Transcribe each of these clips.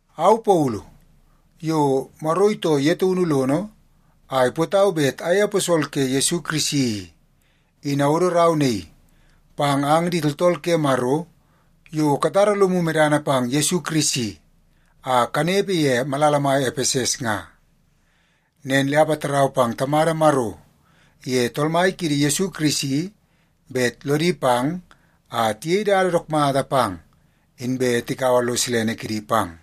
Au Paulu, yo Maro itoo ye taunu lono a ipootau bet ayei aposol ke Yesu Kirisi i, in awodo rau naii pang ang di tooltool ke Maro yo katara lomu medana pang Yesu Kirisi a kanepe ye malala mai Epeses nga. Nen le apatarau pang Tamada Maro iye Tool Mai kiidi Yesu Kirisi bet lodi pang a tiyei dada dook mata pang, inbe tikaua lo silene kidi pang.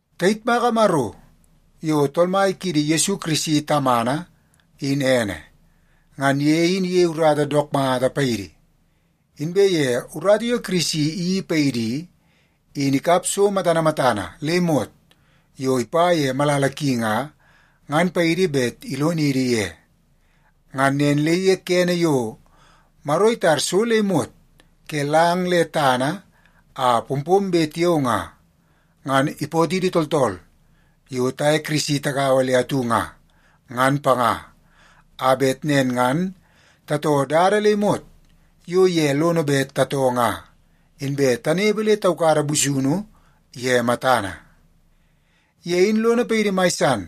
Tayitmaka Maro yo Tool Mai kiidi Yesu Kirisi Tamana, in ene. Ngan ye in iyei urata dook mata paidi, inbe ye urata yo Kirisi iyeii paidi i, in ikap so matana matana le imot yo ipa ye malala ki nga, ngan paidi bet ilonidi ye. Ngan nen le ye kene yo Maro itar so le imot ke lang le tana a pompombe tiao nga, ngan ipootidi tooltool yo taye Kirisi tagaua le atu nga, ngan panga, a bet nen ngan tatoo dada le imot yo ye lono bet tatoo nga, inbe tanepe le taukada busunu ye matana. Ye in lono paidi mai san,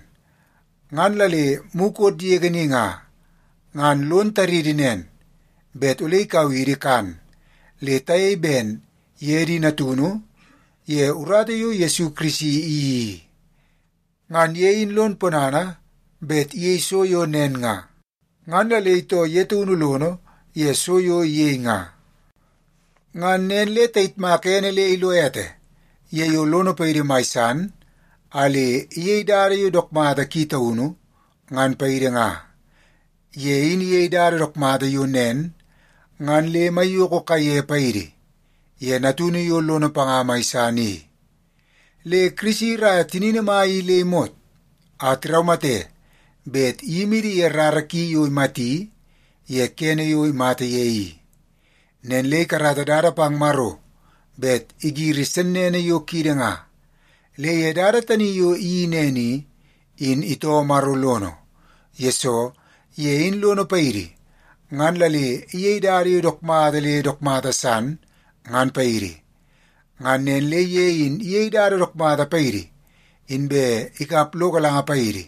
ngan la le mukot yege ni nga, ngan lon taridi nen, bet ole ikau idi kan le tayei ben ye di natunu ye urata yo Yesu Kirisi iyeii i. Ngan ye in lon ponana bet iyei so yo nen nga, ngan la le itoo ye taunu lono ye so yo iyei nga. Ngan nen le tayitmaka ene le ilo ete ye yo lono paidi mai san a le iyei dada yo dook mata ki taunu, ngan paidi nga. Ye in iyei dada dook mata yo nen ngan le maiyoko kaiye paidi, ye Natunu yo lono panga mai san i. Le Kirisi iraia tinini mai i le imot a tiraumate bet iyimidi ye rara ki yo imati ye kene yo imata ye i. Nen le ikarata dada pang Maro bet igiri sennene yo kiidi nga. Le ye dada tani yo iyeii nen i, in itoo Maro lono, yesoo ye in lono paidi ngan la le iyei dada yo dook mata le dook mata san, ngan paidi. Ngan nen le ye in iyei dada dook mata paidi, inbe ikap lo galanga paidi,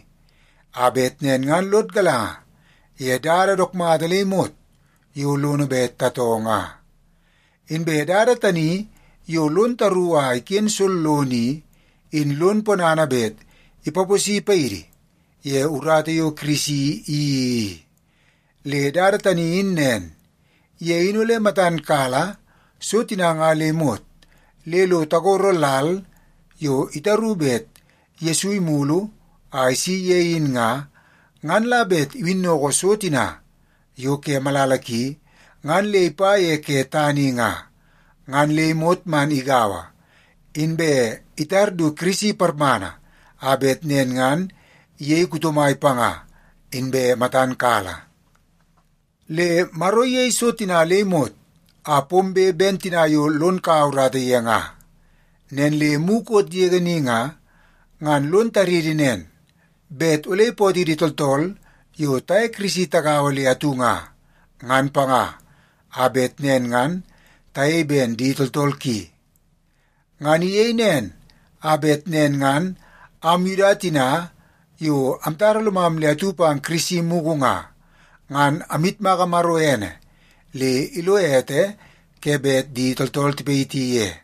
a bet nen ngan lod galanga ye dada dook mata le imot yo lono bet tatoo nga. Inbe dada tani yo lon taru a iken sollono i, in lon ponana bet ipaposi paidi ye urata yo Kirisi iyeii i. Le dada tani in nen: Ye in ole matan kala so tina nga le imot le lo tagoro lal yo itaru bet Yesu imulu a isi ye in nga, ngan la bet iwinnoko so tina yo ke malala ki ngan le ipa ye ke tana i nga, ngan le imot man igaua, inbe itar du Kirisi parmana a bet nen ngan iyei kuto mai panga inbe matan kala. Le Maro in iyei so tina le imot a pombe ben tina yo lon kaua urata ye nga. Nen le mukot yege ni nga, ngan lon taridi nen, bet ole ipootidi tooltool yo taye Kirisi tagaua le atu nga, ngan panga, a bet nen ngan tayei ben di tooltool ki. Ngan iyei nen a bet nen ngan am Yuda tina yo amtara lomam le atu pang Kirisi mugu nga, ngan amyitmaka Maro ene le ilo ete ke bet di tooltool tipayiti ye.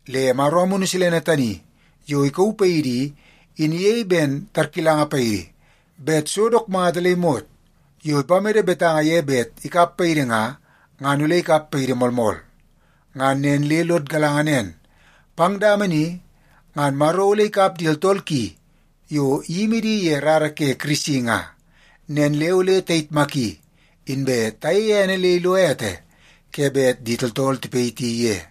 Le Maro Amunu Silene tani yo ikauu paidi i, in iyei ben tarkilanga paidi bet so dook mata le imot yo ipamede betanga ye bet ikap paidi nga, ngan ole ikap paidi moolmool. Ngan nen le lod galanga nen, pang dama ni ngan Maro ole ikap di tooltool ki yo iyimi di ye rara ke Kirisi nga. Nen le ole tayitmaki, inbe tayeie ene le ilo ete ke bet di tooltool tipayiti ye.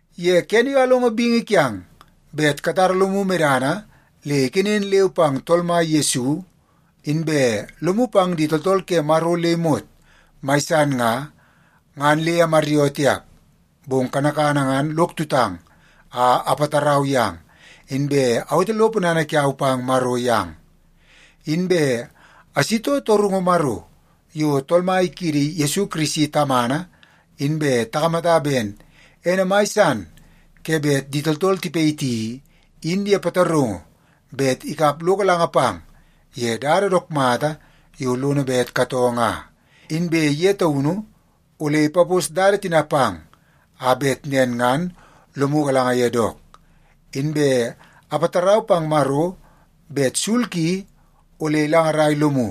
Ye kene yo alongo bingi kiang bet katara lomu medana le ikenen leu pang Tool Mai Yesu, inbe lomu pang di tooltool ke Maro le imot mai san nga, ngan le amaryoo tiap, bong kanakana ngan lok tutang a apatarau yang, inbe awete lo ponana kiau pang Maro yang. Inbe asitoo torungu Maro, yo Tool Mai kiidi Yesu Kirisi Tamana inbe takamata ben ene mai san ke bet di tooltool tipayiti i, in ye pataraungu bet ikap lo galanga pang ye dada dook mata yo lono bet katoo nga, inbe ye taunu ole ipapos dada tina pang, a bet nen ngan lomu galanga ye dook. Inbe apatarau pang Maro bet sul ki ole ilangarai lomu,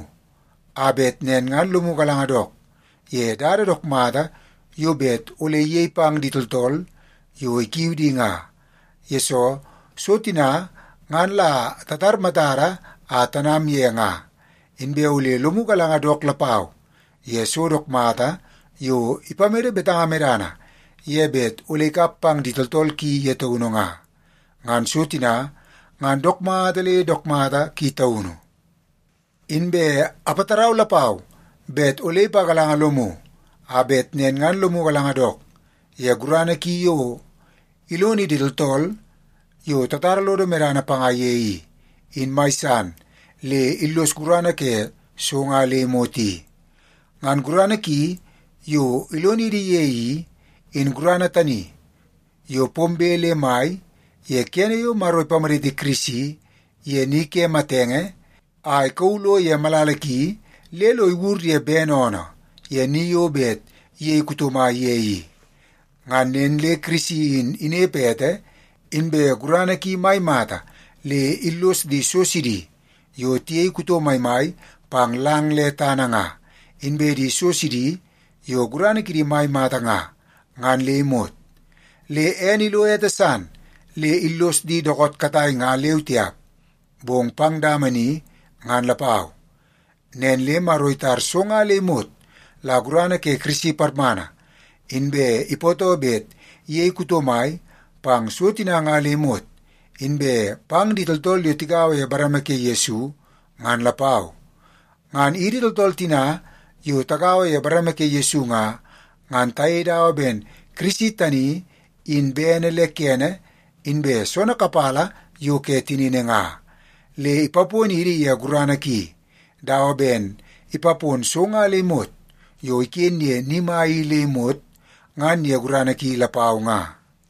a bet nen ngan lomu galanga dook ye dada dook mata yo bet ole iyei pang di tooltool yo ikiu di nga, yesoo so tina ngan la tatar matada a tanam ye nga, inbe ole lomu galanga dook lapau ye so dook mata yo ipamede betanga medana ye bet ole ikap pang di tooltool ki ye taunu nga. Ngan so tina ngan dook mata le dook mata ki taunu. Inbe apatarau lapau bet ole ipagalanga lomu, a bet nen ngan lomu galanga dook ye gurana ki yo ilonidi tooltool yo tatara lodo medana panga ye i, in mai san le illos gurana ke so nga le imot i. Ngan gurana ki yo ilonidi ye i, in gurana tani yo pombe le mai ye kene yo Maro ipamaditi Kirisi ye ni ke matenge a ikauu lo ye malala ki le lo iwur ye bene oonoo ye ni yo bet iyei kuto mai ye i. Ngan nen le Kirisi in inepe ete, inbe gurana ki mai mata le illos di so sidi yo tiyei kuto maimai pang lang le tana nga, inbe di so sidi yo gurana kidi mai mata nga, ngan le imot. Le ene ilo ete san, le illos di dookoot katai ngan leu tiap, bong pang dama ni ngan lapau. Nen le Maro itar so nga le imot la gurana ke Kirisi parmana, inbe ipootoo bet iyei kuto mai pang so tina nga le imot, inbe pang di tooltool yo tigaua ye bareme ke Yesu ngan lapau. Ngan idi tooltool tina yo tagaua ye bareme ke Yesu nga, ngan tayei dawa ben Kirisi tani in bene le kene inbe soonoo kapala yo ke tinini nga. Le ipaponidi ye gurana ki, dawa ben ipapon so nga le imot yo iken ye ni mai i le imot ngan ye gurana ki lapau nga.